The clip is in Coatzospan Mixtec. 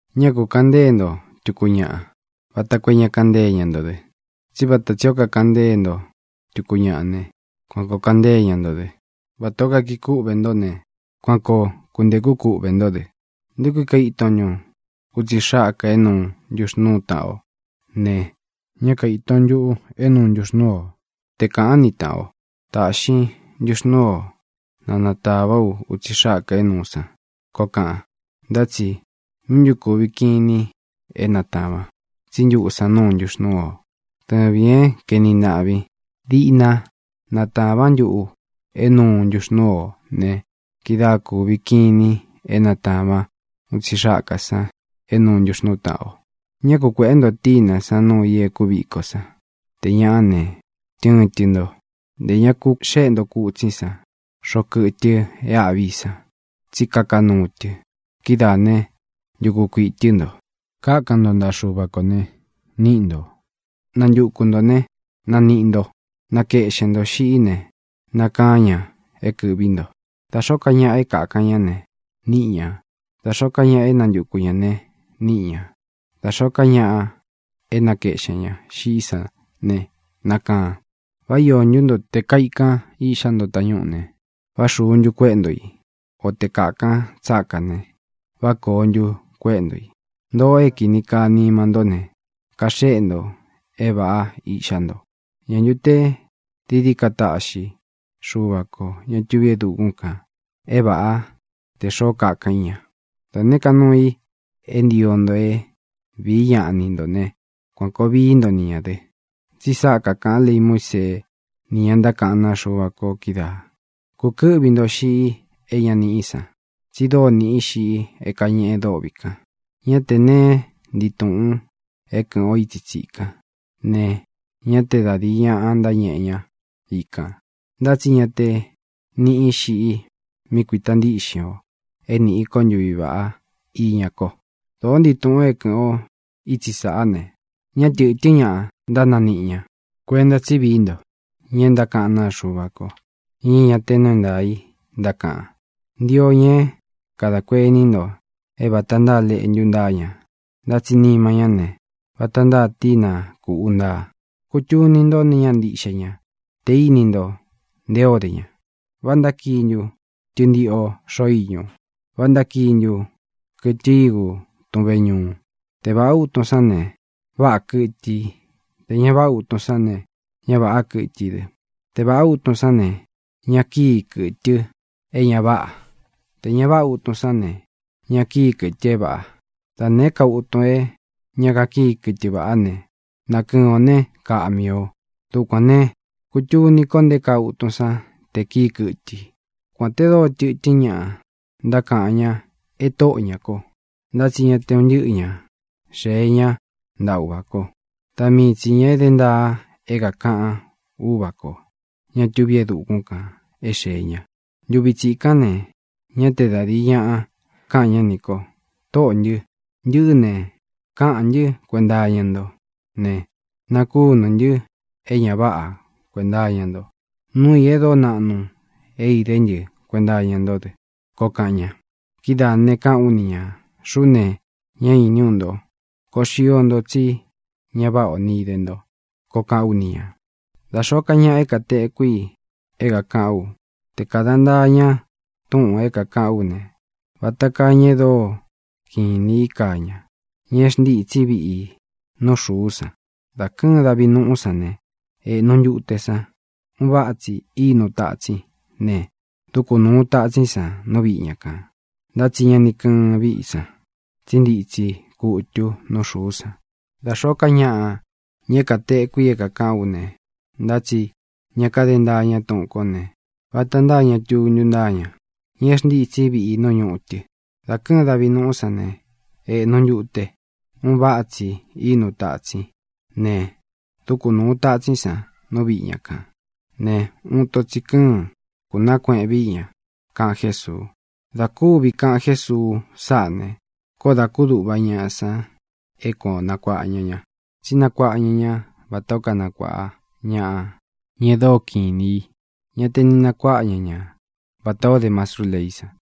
ʼÑá ku kāꞌan ntée nto tuku ñaꞌa, vata koo é ña kaꞌan ntée ña nto dɨ. Tsí vata tsī ó kakaꞌan ntée nto tuku ñaꞌa ne, kuan kōo kaꞌan ntée ña nto dɨ. Vatā ó kakii kúꞌvē ntó ne, kuan koo kuntēkú kūꞌve ntó dɨ. ¿Nté kui kaiton ntun utsi xákā é nuu ntuxnūú taꞌan o ne, ñá kaīton ntuꞌu é nuu ntuxnúu o? Te kāꞌán ni tāꞌan o: “Tāꞌxin ntuxnúu o, na nātavá u utsi xákā é nūu san”, koo kaꞌan, ntá tsi ¿míꞌi ntu kūvi kinin é natāvan, tsí ntuꞌu san núu ntuxnúu o? Dɨvīn é kaeni ntaꞌvín, diꞌna natāván ntuꞌu é nūu ntuxnúu o ne, kidáa kūvi kinin é natāván utsi xákā san é nuu ntuxnūú taꞌan o. ʼÑá ku kuēꞌé nto tínā sán nuu i e kúviko san. Tē ñaꞌá ne, tɨɨn tɨ nto. Ntē ña ku xéꞌe nto kutsín san xoꞌo kɨtɨ e áꞌvi san, tsí kaka nuu tɨ. Kidáā né, ntuku kuiꞌī tɨ́ nto. ʼKákan nto ntaꞌa Xuva kō ne, níꞌi ntō. Nantuku ntō né, naniꞌi nto. Nakeꞌxen ntō xiꞌí ne, nakaán ña é kɨ̄ꞌví nto. Da xōó ka ñaꞌa é kakan ña ne, niꞌi ña. Da xōó ka ñaꞌa é nantuku ñā ne, níꞌi ñā. Da xōó ka ñaꞌa é nakeꞌxen ñā xiꞌí san ne, nakaan. ʼ¿Vá iō ntú nto, te kaīkán iꞌxá nto tañúꞌū ne, vá xūu ntu kuéꞌe nto i? O te kākán tsákā ne, ¿vá kōo ntu kuéꞌe nto i? Ntōꞌo é kīni kaa nima ntó ne, kaxéꞌe nto é vāꞌá iꞌxá nto. ¿Ñā ntu te dií dií ka taꞌxi Xuva kō, ña tuví e dukún kān, é vāꞌá, tē xoó kakan í ña? ʼDa nēé ka nuu i é ntio nto é vīí ñaꞌa ni ntō né, kuan kōo vií nto ni ñā dɨ. Tsi sáꞌa kakāꞌan lei Muísee, ni ña ntákaꞌán naa Xuva ko kídaā. ʼKūkɨ́ꞌvi nto xiꞌi é ña niꞌí san. Tsi dóo nīꞌí xiꞌi é kañeꞌe dôꞌvi kan. Ñá tē neé ntii tūꞌun é kɨ̄ꞌɨn o itsi tsíkan ne, ñá te da dīi ñaꞌa ntáñeꞌe ña ikān. Ntá tsi ña te niꞌí xiꞌi mí kuīta ntíꞌxin ō é nīꞌi ko ntuví vaꞌá iña ko. Dōó ntii tūꞌun é kɨ̄ꞌɨn o itsí sāꞌá ne, ñá tɨ̄tɨ́n ñaꞌa ntánanīꞌi ña. ʼKuenta tsí vií nto ña e ntákaꞌán naa Xuva ko, ña é ña te nuu é ntaā i ntákaꞌan. Ntio ña é kadā kuení nto é vāta ntáa leꞌntu ntáa ña, ntá tsi nima ñá ne, vata ntáa tína kūꞌu ntáa. Kutuni ntó nee ñáꞌa ntiꞌxe ña tē íni nto nté o de ña. ¿Vá ntákii ntu tɨntiꞌo xoꞌo iñū? ¿Vá ntákii ntu kɨtɨ ígu tun veñuu? Te vāꞌá utun sán ne, váꞌā kɨtɨ i. Tē ña váꞌa utun sán ne, ñá vāꞌá kɨtɨ i dɨ. Te vāꞌá utun sán ne, ña kíi kɨtɨ é ña váꞌā. Tē ña váꞌa utun sán ne, ña kíi kɨtɨ é vāꞌa. Da nēé ka utun é ña kakíi kɨtɨ vaꞌá ne, nakɨɨn ō né, kaꞌmi ō. Dukuān ne, kutuni ko nté kaa utun san te kīi kɨ́tɨ i. ʼKuān te dóo tɨtɨ́n ñaꞌa ntákaꞌan ña e Tóꞌo ñā ko, ntá tsi ña te un ntɨꞌɨ ña xēe ñá ntaꞌa Uva kō. Da mii tsī ña e dé ntaa é kākaꞌan Úvā ko, ñá tuví e dukún kān, é xēe ña. Ntuvi tsikán ne, ñá te da dīi ñaꞌa káꞌan ñá nī ko: “Tōꞌó ntɨ, ntɨꞌɨ́ ne, káꞌān ntɨ́ kuenta iña ntó ne, nakúnū ntɨ́ é ña váꞌa kuēnta iña nto. Nuu i é dóo naꞌnu é idé ntɨ kuenta iña ntó dɨ”, koo kaꞌan ña. Kidáā ne, káꞌān ú ni ñā: “Xuꞌú ne, ñá īní u nto. ¡Koo xio nto, tsí ña váꞌā ó ni ide nto!”, koo kaꞌán u ni ñā. ʼDá xōó ka ñaꞌa é kātekú i é kākaꞌán u, te kāda ntaa ña túꞌūn é kākaꞌán u ne, vata kaa ña e dóo kiꞌin inī í kaa ña, ña é xntītsí viꞌi i nú xuú san. Dá kɨ̄ɨn davi nuꞌú san ne, ēꞌnu ntute san. Un váꞌa tsi ínu tatsín ne, dúku nūu tatsín san nú viꞌi ña kān, ntá tsi ña ni kɨ́ɨn viꞌí san, tsí ntitsi kutu nú xūú san. Dá xōó ka ñaꞌa, ña é kātekú i é kākaꞌán u ne, ntá tsi ña káde ntaa ña túꞌūn kó ne, vata ntáa ña tuntu ntáa ña, ña é xntītsí viꞌi i nú ñutɨ. Dā kɨ́ɨn davi nuꞌú san ne, ēꞌnu ntute. Un váꞌa tsi īnu tatsín ne, dúku nūu tatsín san nú viꞌi ña kān ne, uun ito tsī kɨ́ɨn. Kūnaá kueꞌen viꞌi ña —kaꞌan Jésuu. Dā kúvi kaꞌan Jésuu sáꞌā ne, koó dā kúduꞌva ñaꞌa san é kuan ō nakuaꞌa ña ña, tsí nakuaꞌa ña ña vatā ó kanakuāꞌa ñaꞌa, ña e dóo kiꞌin inī i. Ñá te ni nakuaꞌa ña ña vatā ó de mastrú leí san.